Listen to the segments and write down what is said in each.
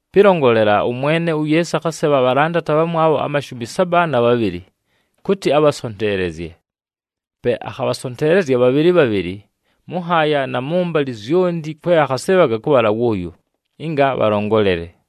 Pɨlongolela, ʉMwene uYeesu akhasebha abhalandati abhamwabho amashumi saba na bhabhɨlɨ, kʉtɨ abhasonteelezye. Pe akhabhasonteelezya bhabhɨlɨ bhabhɨlɨ mʉ nhaaya na mʉmbalɨ zyonti kwe akhasɨɨbhaga kʉbhala wʉʉyo, ɨnga bhalongolele.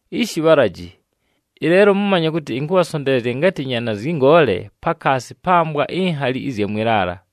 Ishi bhalaji, ɨleelo mʉmanye kʉtɨ ɨnkʉbhasonteelezya ngatɨ nyaana zyɨ ngoole pakaasi pa mbwa inhali ɨzya mwɨ laala!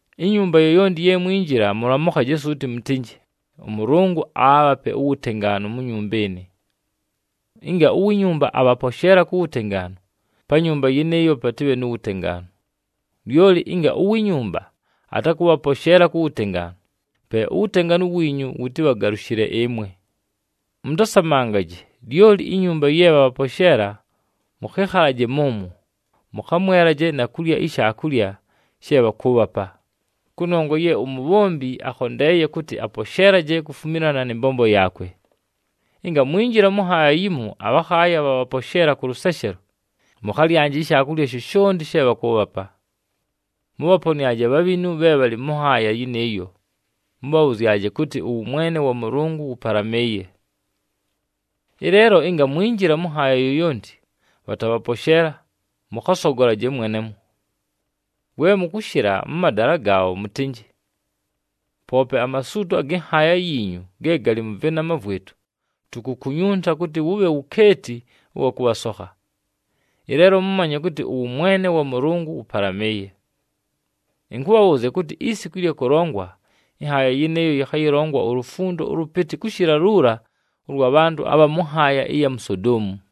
“Inyumba yoyonti ye mwinjila, mʉlamʉkhaje suuti mʉtɨnjɨ, ‘ɄMʉlʉngʉ aabhape uwutengaanu mu nyumba ɨnɨ.’ Ɨnga uwi nyumba abhaposheela ku wutengaanu, pa nyumba yɨnɨɨyo patɨbhe nu wutengaanu. Lyoli ɨnga uwi nyumba atakʉbhaposheela ku wutengaanu, pe uwutengaanu wiinyu wʉtɨbhagalʉshɨle ɨmwe. Mʉtasamangaje, lyoli inyumba ye bhabhaposheela mʉkhɨkhalaje mʉmwo, mʉkhamwelaje na kulya ishaakulya she bhakʉʉbhapa, kʉnongwa ye umubhombi akhondeeye kʉtɨ aposheelaje kufumilana nɨ mbombo yaakwe. “Ɨnga mwinjila mʉ nhaaya yimo, abhakhaaya bhabhaposheela kʉ lʉseshelo, mʉkhalyanje ishaakulya shoshonti she bhakʉʉbhapa. Mʉbhaponɨaje abhabhinu bhe bhalɨ mʉ nhaaya yɨnɨɨyo, mʉbhabhʉzyaje kʉtɨ, ‘Ʉwʉmwene wa Mʉlʉngʉ wʉpalamɨɨye!’ “Ɨleelo ɨnga mwinjila mʉ nhaaya yoyonti, bhatabhaposheela, mʉkhasogolaje mwenemwo. We mʉkʉshɨla mʉ madala gaabho, mʉtɨnjɨ, ‘Poope amasuuto agɨ nhaaya yiinyu ge galɨ mʉ vɨnama vwɨtʉ, tukukunyunta kʉtɨ wʉbhe wukeeti ʉwa kʉbhasokha. Ɨleelo mʉmanye kʉtɨ ʉwʉmwene wa Mʉlʉngʉ wʉpalamɨɨye!’ Ɨnkʉbhabhʉʉzya kʉtɨ, isiku ɨlya kʉlongwa, ɨnhaaya yɨnɨɨyo yɨkhayɨlongwa ulufundo ʉlʉpɨtɨ kʉshɨla luula ʉlwa bhantʉ abha mʉ nhaaya ɨya mu Sodoomu!”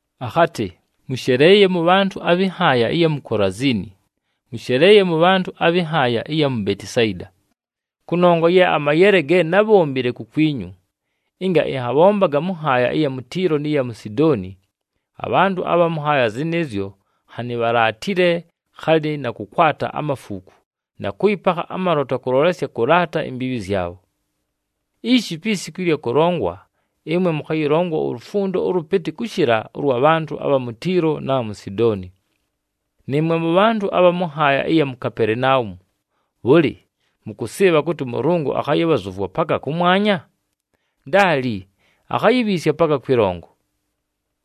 Akhatɨ, “Mʉsheleeye mʉbhantʉ abhɨ nhaaya ɨya mu Kolaziini! Mʉsheleeye mʉbhantʉ abhɨ nhaaya ɨya mu Betisayida! Kʉnongwa ye amayele ge nábhombile kukwinyu, ɨnga ɨnhabhombaga mʉ nhaaya ɨya mu Tiilo nɨ ya mu Sidooni, abhantʉ abha mʉ nhaaya zɨnɨɨzyo nhanɨ bhalaatile khalɨ na kʉkwata amafuuku na kʉyɨpakha amalota kʉlolesya kʉlaata imbiibhi zyabho. Ishi, pi siku ɨlya kʉlongwa, ɨmwe mʉkhayɨlongwa ulufundo ʉlʉpɨtɨ kʉshɨla ʉlwa bhantʉ abha mu Tiilo na bha mu Sidooni! Nɨɨmwe mʉbhantʉ abha mʉ nhaaya ɨya mu Kapelenaumu, bhʉlɨ, mʉkʉsɨɨbha kʉtɨ ʉMʉlʉngʉ akhayɨbhazʉvwa paka kʉmwanya? Ndaali, akhayibhiisya paka kwɨlongo!”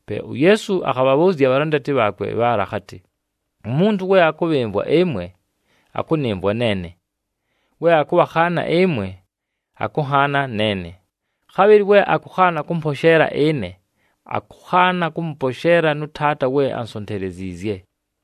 Pe uYeesu akhabhabhʉʉzya abhalandati bhaakwe bhaala akhatɨ, “Umuntu we akʉbhɨmvwa ɨmwe, akʉnɨmvwa neene, we akʉbhakhaana ɨmwe, akʉnhaana neene. Khabhɨlɨ we akʉkhaana kʉmposheela ɨne, akʉkhaana kʉmʉposheela nʉ Taata we ansonteleziizye.”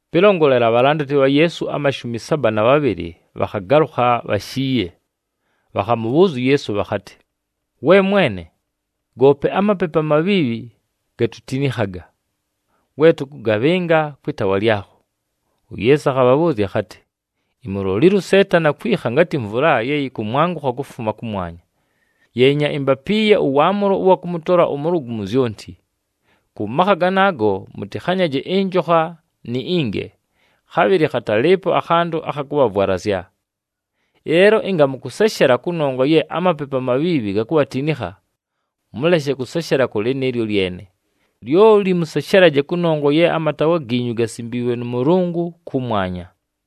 Pɨlongolela, abhalandati bha Yeesu amashumi saba na bhabhɨlɨ bhakhagalʉkha bhashiiye, bhakhamʉbhʉʉzya uYeesu bhakhatɨ, “We Mwene, goope amapepu amabhiibhi gatutinikhaga, we tʉkʉgabhɨnga kwɨ taawa lyakho!” UYeesu akhabhabhʉʉzya akhatɨ, “Imulolile uSeetani akwikha ngatɨ mvula ye yɨkʉmwangʉkha kufuma kʉmwanya. Yeenya, imbapiiye ʉwaamʉlo ʉwa kʉmʉtola ʉmʉlʉgʉ mu zyonti. Kʉ makha ganaago mʉtɨkhanyaje ɨnjokha ni inge, khabhɨlɨ khatalɨɨpo akhantʉ akha kʉbhavwalazya. Ɨleelo ɨnga mʉkʉseshela kʉnongwa ye amapepu amabhiibhi gakubhatinikha, mʉleshe kʉseshela kʉ lɨnɨɨlyo lyene, lyoli mʉseshelaje kʉnongwa ye amataawa giinyu gasimbiilwe nʉ Mʉlʉngʉ kʉmwanya.”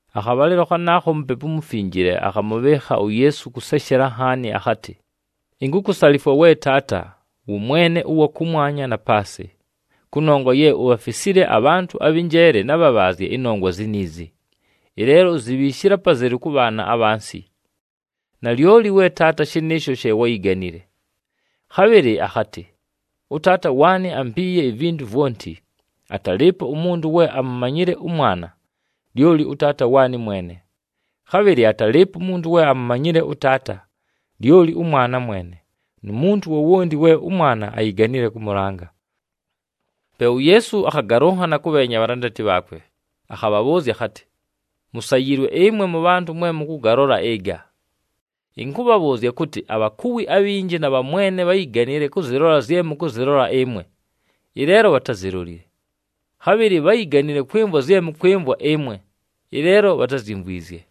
Akhabhalɨlo khanaakho, uMupepu uMufinjile akhamʉbhɨɨkha uYeesu kʉseshela nhaani akhatɨ, “Inkukusalifwa we Taata, wʉMwene ʉwa kʉmwanya na paasɨ, kʉnongwa ye ubhafisile abhantʉ abhɨ njeele na bhabhaazye ɨnongwa ziniizi, ɨleelo uzibhiishile apazelu kʉ bhaana abhansi. Nalyoli we Taata, shɨnɨɨsho she wáyiganile.” Khabhɨlɨ akhatɨ, “ɄTaata waanɨ ampiiye ivintu vwonti. Atalɨɨpo umuntu we amumanyile ʉMwana, lyoli ʉTaata waanɨ mwene. Khabhɨlɨ atalɨɨpo umuntu we amumanyile ʉTaata, lyoli ʉMwana mwene, nu muntu wowonti we ʉMwana ayiganile kʉmʉlanga.” Pe uYeesu akhagalʉnhana kʉbheenya abhalandati bhaakwe akhabhabhʉʉzya akhatɨ, “Musayiilwe ɨmwe mʉbhantʉ mwe mʉkʉgalola ɨga! Ɨnkʉbhabhʉʉzya kʉtɨ, abhakuwi abhinji na bhamwene bháyiganile kʉzɨlola zye mʉkʉzɨlola ɨmwe, ɨleelo bhatázilolile. Khabhɨlɨ bháyiganile kwɨmvwa zye mʉkwɨmvwa ɨmwe, ɨleelo bhatázyimvwizye.”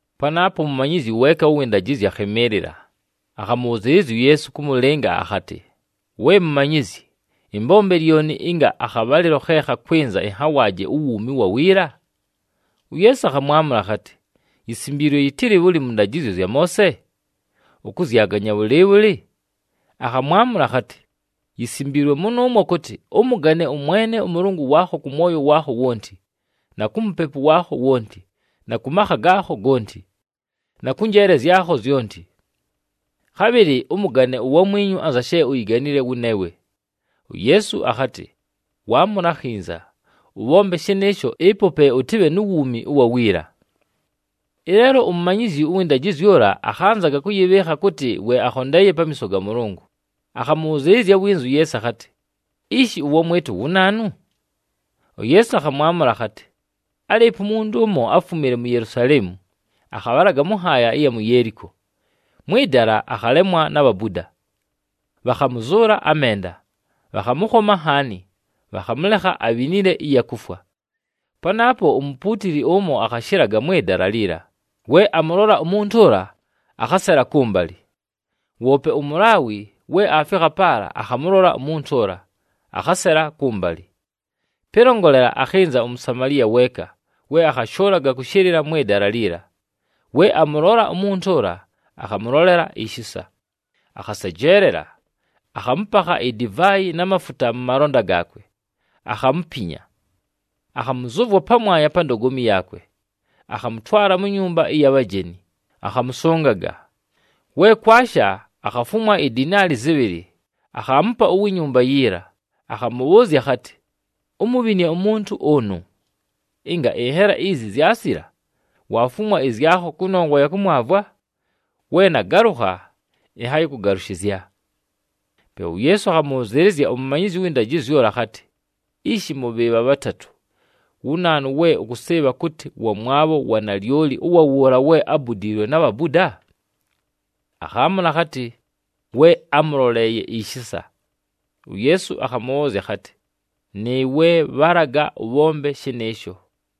Panaapo umumanyizyi weeka ʉwɨ ndajɨzyo akhɨmɨɨlɨla, akhamʉbhʉzɨɨlɨzya uYeesu kʉmʉlɨnga akhatɨ, “We Mumanyizyi, ɨmbombe lyoni ɨnga akhabhalɨlo khe khakwɨnza ɨnhawaaje uwuumi ʉwa wiila?” UYeesu akhamwamʉla akhatɨ, “Yisimbiilwe yɨtɨlɨ bhʉlɨ mʉ ndajɨzyo zya Moose? Ʉkʉzyaganya bhʉlɨɨbhʉlɨ?” Akhamwamʉla akhatɨ, “Yisimbiilwe mʉnʉʉmwo kʉtɨ, ‘Ʉmʉgane ʉMwene ʉMʉlʉngʉ waakho kʉ mwoyo waakho wonti, na ku mupepu waakho wonti, na kʉ makha gaakho gonti, na kʉ njeele zyakho zyonti.’ Khabhɨlɨ, ‘Ʉmʉgane uwamwinyu anza she uyiganile wʉneewe.’” UYeesu akhatɨ, “Waamʉla akhinza! Ʉbhombe shɨnɨɨsho, ɨpo pe ʉtɨbhe nu wuumi ʉwa wiila.” Ɨleelo umumanyizyi ʉwɨ ndajɨzyo ʉla akhanzaga kʉyɨbhɨɨkha kʉtɨ we akhondeeye pamiiso ga Mʉlʉngʉ, akhamʉbhʉzɨɨlɨzya winza uYeesu akhatɨ, “Ishi, ʉwamwɨtʉ wu naanu?” UYeesu akhamwamʉla akhatɨ, “Álɨɨpo umuntu ʉmo, áfumile mu Yelusaleemu, akhabhalaga mʉ nhaaya ɨya mu Yeeliko. Mwɨ dala, akhalemwa na bhabuda, bhakhamʉzʉʉla amenda, bhakhamʉkhoma nhaani, bhakhamʉlekha abhinile ɨya kufwa. Panaapo umupuutili ʉmo akhashɨlaga mwɨ dala liila, we amʉlola umuntu ʉla, akhasela kʉmbalɨ. Woope uMulaawi we aafikha paala akhamʉlola umuntu ʉla, akhasela kʉmbalɨ. Pɨlongolela, akhɨnza uMusamaliya weeka, we akhashʉʉlaga kʉshɨlɨla mwɨ dala liila. We amʉlola umuntu ʉla, akhamʉlolela ishisa, akhasejeelela, akhamʉpakha idivaayi na mafuta mʉ malonda gaakwe, akhamupinya. Akhamʉzʉvwa pamwanya pa ndogomi yaakwe, akhamʉtwala mu nyumba ɨya bhajeni, akhamʉsʉngaga. We kwasha, akhafumwa idinaali zɨbhɨlɨ, akhaamupa uwi nyumba yiila, akhamʉbhʉʉzya akhatɨ, ‘Umubhinie umuntu ʉnʉ. Ɨnga ɨnhela izi zyasila, waafumwa ɨzyakho kʉnongwa ya kʉmwavwa, we nagalʉkha, ɨnhayɨkʉgalʉshɨzya.’” Pe uYeesu akhamʉbhʉzɨɨlɨzya umumanyizyi ʉwɨ ndajɨzyo ʉla akhatɨ, “Ishi, mʉ bhɨɨbha bhatatʉ, wu naanu we ʉkʉsɨɨbha kʉtɨ wamwabho wa nalyoli ʉwa wʉʉla we ábudiilwe na bhabuda?” Akhaamʉla akhatɨ, “We ámʉloleeye ishisa.” UYeesu akhamʉbhʉʉzya akhatɨ, “Nɨɨwe bhalaga ʉbhombe shɨnɨɨsho!”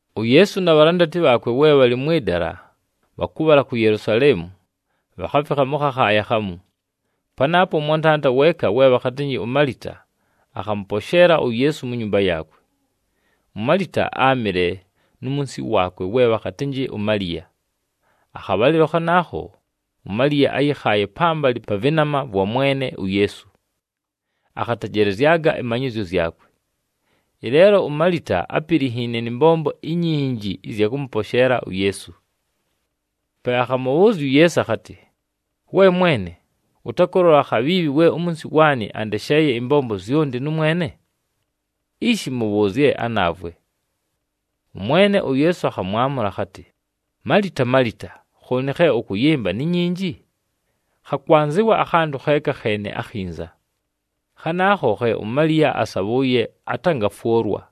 UYeesu na bhalandati bhaakwe we bhalɨ mwɨ dala bhakʉbhala ku Yelusaleemu, bhakhafikha mʉ khakhaaya khamu. Panaapo ʉmwantanda weeka, we bhakhatɨnjɨ uMalita, akhamʉposheela uYeesu mu nyumba yaakwe. UMalita áamɨle nu munsi waakwe we bhakhatɨnjɨ uMaliya. Akhabhalɨlo khanaakho, uMaliya áyɨkhaaye pambalɨ pa vɨnama vwa Mwene uYeesu, akhatejelezyaga ɨmanyɨzyo zyakwe. Ɨleelo uMalita ápilinhiine nɨ mbombo inyinji ɨzya kʉmʉposheela uYeesu. Pe akhamʉbhʉʉzya uYeesu akhatɨ, “We Mwene, ʉtakʉlola khabhiibhi we umunsi waanɨ andesheeye ɨmbombo zyonti nʉmwene? Ishi mʉbhʉʉzye anaavwe!” ɄMwene uYeesu akhamwamʉla akhatɨ, “Malita, Malita, khooni khe ʉkʉyɨmba ni nyinji? Khakwanzɨwa akhantʉ kheeka kheene akhinza. Khanaakho khe uMaliya asabhʉʉye, atangafwʉlwa.”